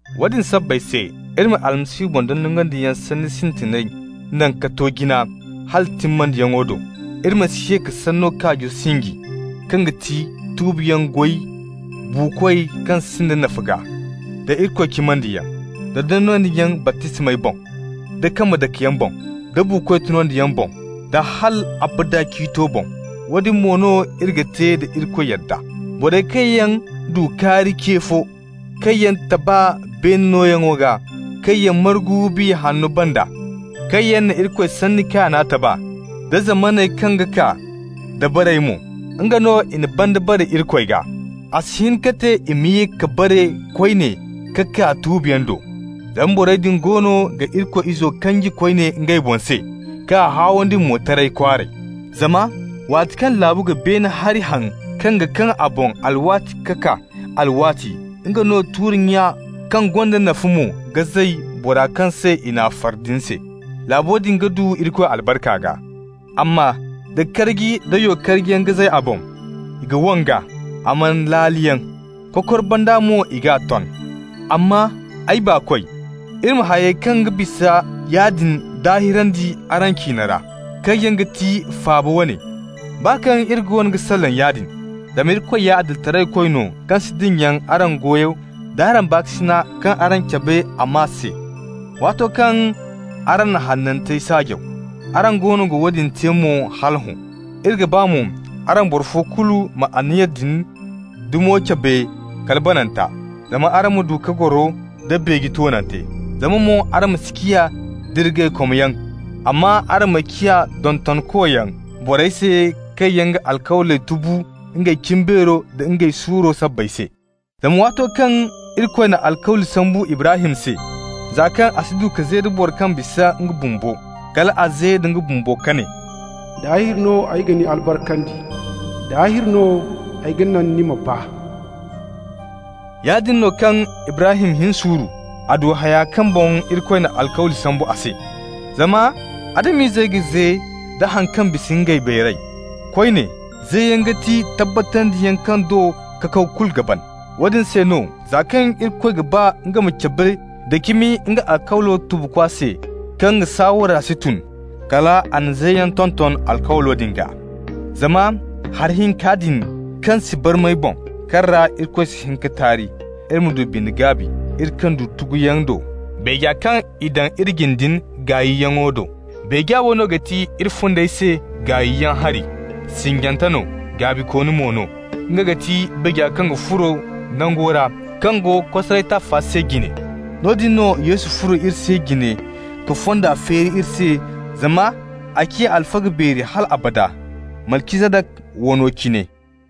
Woodin sabbay se, iri ma Almasihu boŋ dondonandiyaŋ sanni sintiney naŋ ka to jina hala timmandiyaŋo do. Iri ma si ye ka sanno kaajo sinji, kaŋ ga ti tuubiyaŋ goy buukoy kaŋ sinda nafa gaa, da Irikoy cimandiyaŋ, da dondonandiyaŋ baptismey boŋ, da kambe dakeyaŋey boŋ, da buukoy tunyaŋo boŋ, da hal abada ciito boŋ. Woodin mo no iri ga te da Irikoy yadda. Borey kaŋ yaŋ du kaari ce fo, kaŋ yaŋ taba beene nooyaŋo gaa, kaŋ yaŋ margu Biya Hanno banda, kaŋ yaŋ na Irikoy sanni kaana taba, da zamaney kaŋ ga kaa dabarey mo, nga no i na banda bare Irikoy gaa -- a si hin ka te i ma ye ka bare koyne ka kaa tuubiyaŋ do. Zama borey din goono ga Irikoy Izo kanji koyne ngey boŋ se, k'a haawandi mo taray kwaaray. Zama waati kaŋ laabu ga beene hari haŋ kaŋ ga kaŋ a boŋ alwaati ka kaa alwaati, nga no tuuri kaŋ gonda nafa mo ga zay bora kaŋ se i n'a far din se, laabo din ga du Irikoy albarka gaa. Amma da karji nda yo-karjiyaŋ ga zay a boŋ, i ga wang'a. A maan laaliyaŋ. Kokor banda mo i g'a ton. Amma, ay baakoy, iri na hayey kaŋ ga bisa yaadin daahirandi araŋ ciine ra, kaŋ yaŋ ga ti faaba wane, baa kaŋ iri goono ga salaŋ yaadin. Zama Irikoy ya Adilitaraykoy no kaŋ si dinya araŋ goyo d'araŋ baakasina kaŋ araŋ cabe a maa se, waato kaŋ araŋ na hanantey saajaw. Araŋ goono ga woodin te mo hala hõ. Iri ga ba mo araŋ boro fo kulu ma anniya din dumo cabe kala bananta, zama araŋ ma du ka goro nda beeje toonante. Zama mo araŋ ma si ciya dirgaykomyaŋ, amma araŋ ma ciya dondonkoyaŋ borey se kaŋ yaŋ ga alkawley tubu ngey cimbeero da ngey suuro sabbay se. Zama waato kaŋ Irikoy na alkawli sambu Ibrahim se, za kaŋ a si du ka ze da boro kaŋ bisa nga bumbo, kal a ze da nga boŋ ka ne: «Daahir no ay ga ni albarkandi, daahir no ay ga naŋ ni ma baa.» Yaadin no, kaŋ Ibrahim hin suuru, a du haya kaŋ boŋ Irikoy na alkawli sambu a se. Zama Adam-izey ga ze da haŋ kaŋ bisa ngey beeray. Koyne, zeyaŋ ga ti tabbatandiyaŋ kaŋ do kakaw kulu ga ban. Woodin se no za kaŋ Irikoy ga ba nga ma cabe nda cimi nga alkawlo tubukoy se kaŋ nga saawara si tun, kal a na zeyaŋ tonton alkawlo din gaa. Zama hari hinka din kaŋ si barmay boŋ, kaŋ ra Irikoy si hin ka taari, iri ma du bine gaabi, iri kaŋ du tuguyaŋ do, beeja kaŋ i daŋ iri jine din gaayyaŋo do. Beeja wo no ga ti iri fundey se gaayyaŋ hari, sinjante no, gaabikooni mo no. Nga ga ti beeja kaŋ ga furo nango ra kaŋ go kosaray taafa se jine. Noodin no Yesu furo iri se jine ka fonda feeri iri se, zama a ciya alfaga beeri hal abada, Malcizadaka wano cine.